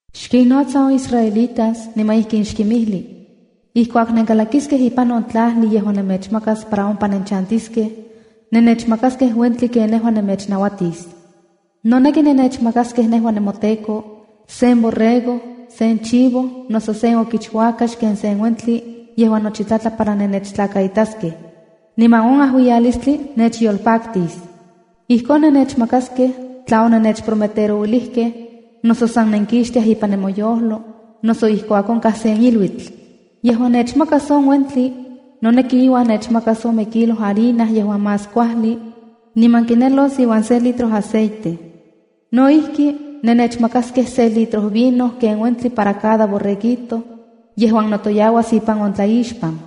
“Xkinnotsa on israelitas niman ijkin xkinmijli: Ijkuak nenkalakiskej ipan on tlajli yejuan nemechmakas para ompa nenchantiskej, nennechmakaskej uentin ken nejua nemechnauatis. Noneki nennechmakaskej nejua nemoTEKO, sen borrego, sen chivo, noso sen okichuakax ken se uentli yejuan nochi tlatla para nennechtlakaitaskej, niman on iajuiyalis nechyolpaktis. Ijkon nennechmakaskej tla onennechprometerouilijkej, noso san nenkixtiaj ipan nemoyojlo, noso ijkuak onkaj sen iluitl. Yejuan nechmakas on uentli, noneki iuan nechmakas ome kilo harina yejuan más kuajli niman kinelos iuan se litro aceite. No ijki, nechmakaskej se litro vino ken uentli para cada borreguito yejuan notoyauas ipan on tlaixpan.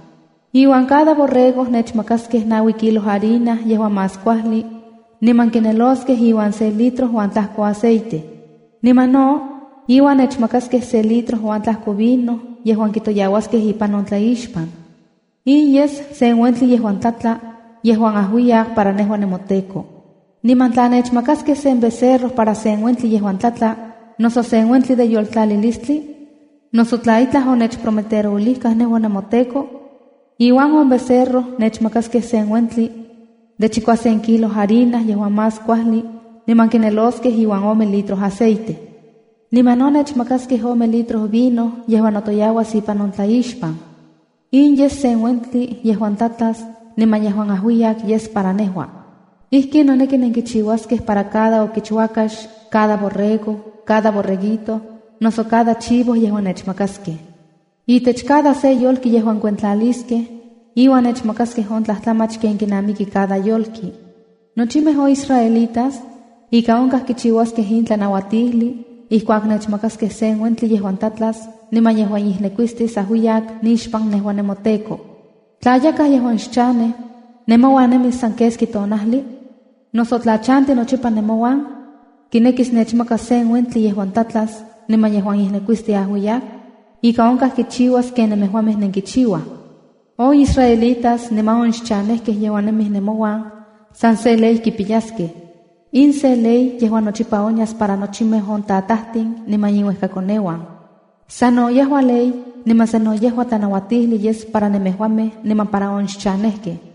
Iuan cada borrego, nechmakaskej naui kilo harina yejuan más kuajli niman kineloskej iuan se litro uan tlajko aceite. Niman no iuan nechmakaskej se litro uan tlajko vino yejuan kitoyauaskej ipan on tlaixpan. In yes sen uentli yejuan tlatla yejuan auiyak para nejua nemoTEKO. Niman tla nechmakaskej sen becerro para sen uentli yejuan tlatla, noso sen uentli de yoltlalilistli, noso tla itlaj onechprometerouilijkaj nejua nemoTEKO, iuan on becerro nechmakaskej sen uentli de chikuasen kilo harina yejuan más kuajli niman kineloskej iuan ome litro aceite. Niman no nechmakaskej ome litro vino yejuan notoyauas ipan on tlaixpan. In yes sen uentli yejuan tlatlas niman yejuan ajuiyak yes para nejua. Ijkin noneki nenkichiuaskej para cada okichuakax, cada borrego, cada borreguito, noso cada chivo yejuan nechmakaskej. Itech cada se yolki yejuan kuentlaliskej, iuan nechmakaskej on tlajtlamach ken kinamiki cada yolki. Nochimej on israelitas ika onkaj kichiuaskej in tlanauatijli ijkuak nechmakaskej sen uentli yejuan tlatlas niman yejuan ijnekuistis ajuiyak nixpan nejua nemoTEKO. ’Tla yakaj yejuan xchanej, nemouan nemis san keski tonajli, noso tla chanti nochipa nemouan, kinekis nechmakas sen uentli yejuan tlatlas niman yejuan ijnekuistis ajuiyak, ika onkaj kichiuas ken nemejuamej nenkichiuaj. On israelitas niman on xchanejkej yejuan nemij nemouan san se ley kipiyaskej. In sen ley yejuan nochipa onyas para nochimej on tatajtin niman inuejkakoneuan. Sano yejua ley niman sa no yejua tlanauatijli yes para nemejuamej niman para on xchanejkej.”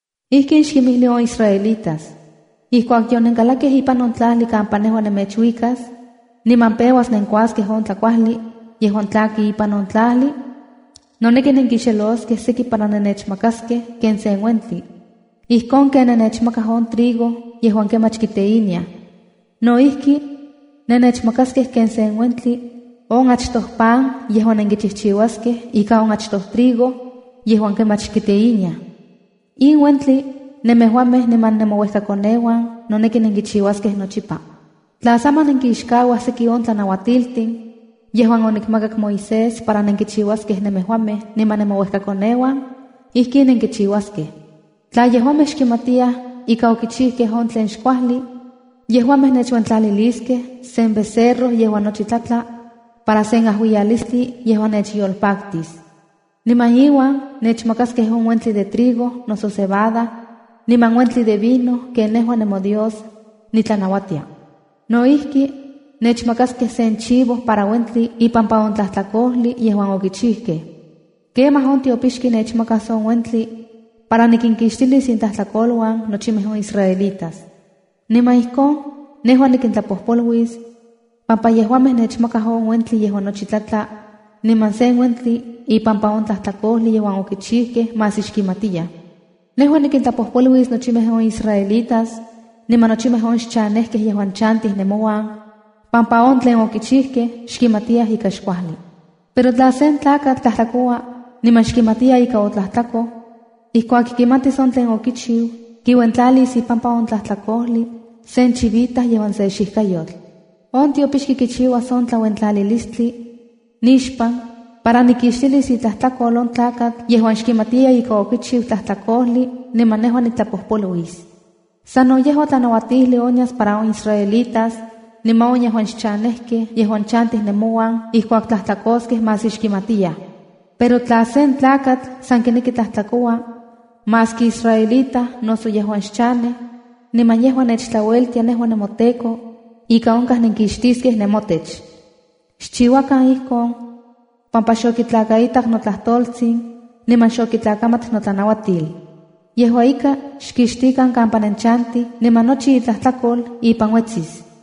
“Ijkin xkinmijli on israelitas: Ijkuak yonenkalakej ipan on tlajli kampa nejua nemechuikas, niman peuas nenkuaskej on tlakuajli yejuan tlaki ipan on tlajli, noneki nenkixeloskej seki para nennechmakaskej ken sen uentli. Ijkon ken nennechmakaj on trigo yejuan kemach kiteiniaj, no ijki nennechmakaskej ken sen uentli on achtoj pan yejuan nenkichijchiuaskej ika on achtoj trigo yejuan kemach kiteiniaj. In uentli, nemejuamej niman nemouekakoneuan noneki nenkichiuaskej nochipa. ’Tla saman nenkixkauaj seki on tlanauatiltin yejuan onikmakak Moisés para nenkichiuaskej nemejuamej niman nemouejkakoneuan, ijkin nenkichiuaskej: ’Tla yejuamej xkimatiyaj ika okichijkej on tlen xkuajli, yejuamej nechuentlaliliskej sen becerro yejuan nochi tlatla para sen ajuiyalistli yejuan nechyolpaktis. Niman iuan nechmakaskej on uentli de trigo noso cebada, niman uentli de vino ken nejua nemoDios nitlanauatia. No ijki, nechmakaskej sen chivo para uentli ipampa on tlajtlakojli yejuan okichijkej. Kemaj on tiopixki nechmakas on uentli para nikinkixtilis intlajtlakoluan nochimej on israelitas. Niman ijkon nejua nikintlapojpoluis, pampa yejuamej nechmakaj on uentli yejuan nochi tlatla, niman sen uentli ipampa on tlajtlakojli yejuan okichijkej maski xkimatiyaj. Nejua nikintlapojpoluis nochimej on israelitas niman nochimej on xchanejkej yejuan chantij nemouan, pampa on tlen okichijkej xkimatiyaj ika xkuajli. ’Pero tla sen tlakatl tlajtlakoua, niman xkimatiya ika otlajtlakoj, ijkuak kimatis on tlen okichiu, kiuentlalis ipampa on tlajtlakojli sen chivita yejuan se xijkayotl. On tiopixki kichiuas on tlauentlalilistli nixpan para nikixtilis itlajtlakol on tlakatl yejuan xkimatiya ika okichiu sen tlajtlakojli, niman nejua niktlapojpoluis. Sano yejua tlanauatijli onyas para on israelitas niman on yejuan xchanejkej yejuan chantij nemouan ijkuak tlajtlakoskej maski xkimatiyaj. ’Pero tla sen tlakatl san kineki tlajtlakoua, maski israelita noso yejuan xchanej, niman yejua nechtlaueltia nejua nemoTEKO, ika onkaj nenkixtiskej nemotech. Xchiuakan ijkon pampa xokitlakaitak notlajtoltsin niman xokitlakamat notlanauatil. Yejuan ika xkixtikan kampa nenchantij, niman nochi itlajtlakol ipan uetsis.”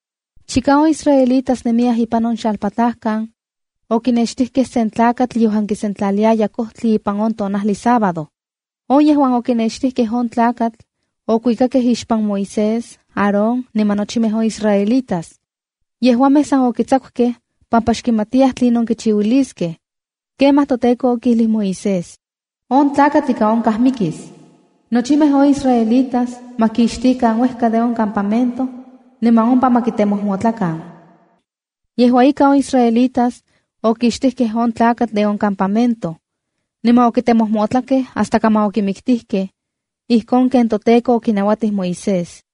Chika on isaelitas nemiyaj ipan on xalpatlajkan, okinextijkej sen tlakatl yejuan kisentlaliaya kojtli ipan on tonajli Sábado. On yejuan okinextijkej on tlakatl okuikakej ixpan Moisés, Aaron, niman nochimej on israelitas. Yejuamej san okitsakukej pampa xkimatiyaj tlinon kichiuiliskej. Kemaj toTEKO okijlij Moisés: “On tlakatl ika onkaj mikis. Nochimej on israelitas ma kixtikan uejka de on campamento niman ompa ma kitemojmotlakan.” Yejua ika, on israelitas okixtijkej on tlakatl de on campamento. Niman okitemojmotlakej hasta kaman okimiktijkej, ijkon ken toTEKO okinauatij Moisés.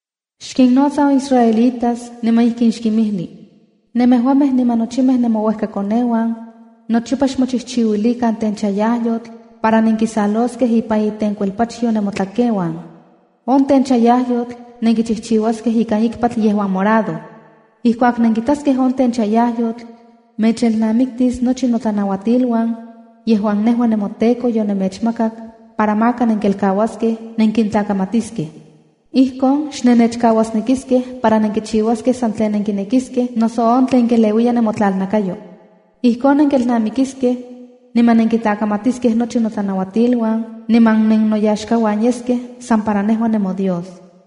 “Xkinnotsa on israelitas, niman ijkin xkinmijli: Nemejuamej niman nochimej nemouejkakoneuan nochipa xmochijchiuilikan tenchayajyotl para nenkisaloskej ipan itenkuelpachyo nemotlakeuan. On tenchayajyotl nenkichijchiuaskej ikan ikpatl yejuan morado. Ijkuak nenkitaskej on tenchayajyotl, mechelnamiktis nochi notlanauatiluan yejuan nejua nemoTEKO yonemechmakak para maka nenkelkauaskej nenkintlakamatiskej. Ijkon xnennechkauasnekiskej para nenkichiuaskej san tlen nenkinekiskej noso on tlen keleuiya nemotlalnakayo. Ijkon nenkelnamikiskej niman nenkintlamatiskej nochi notlanauatiluan, niman nennoyaxkauan yeskej san para nejua, nemoDios.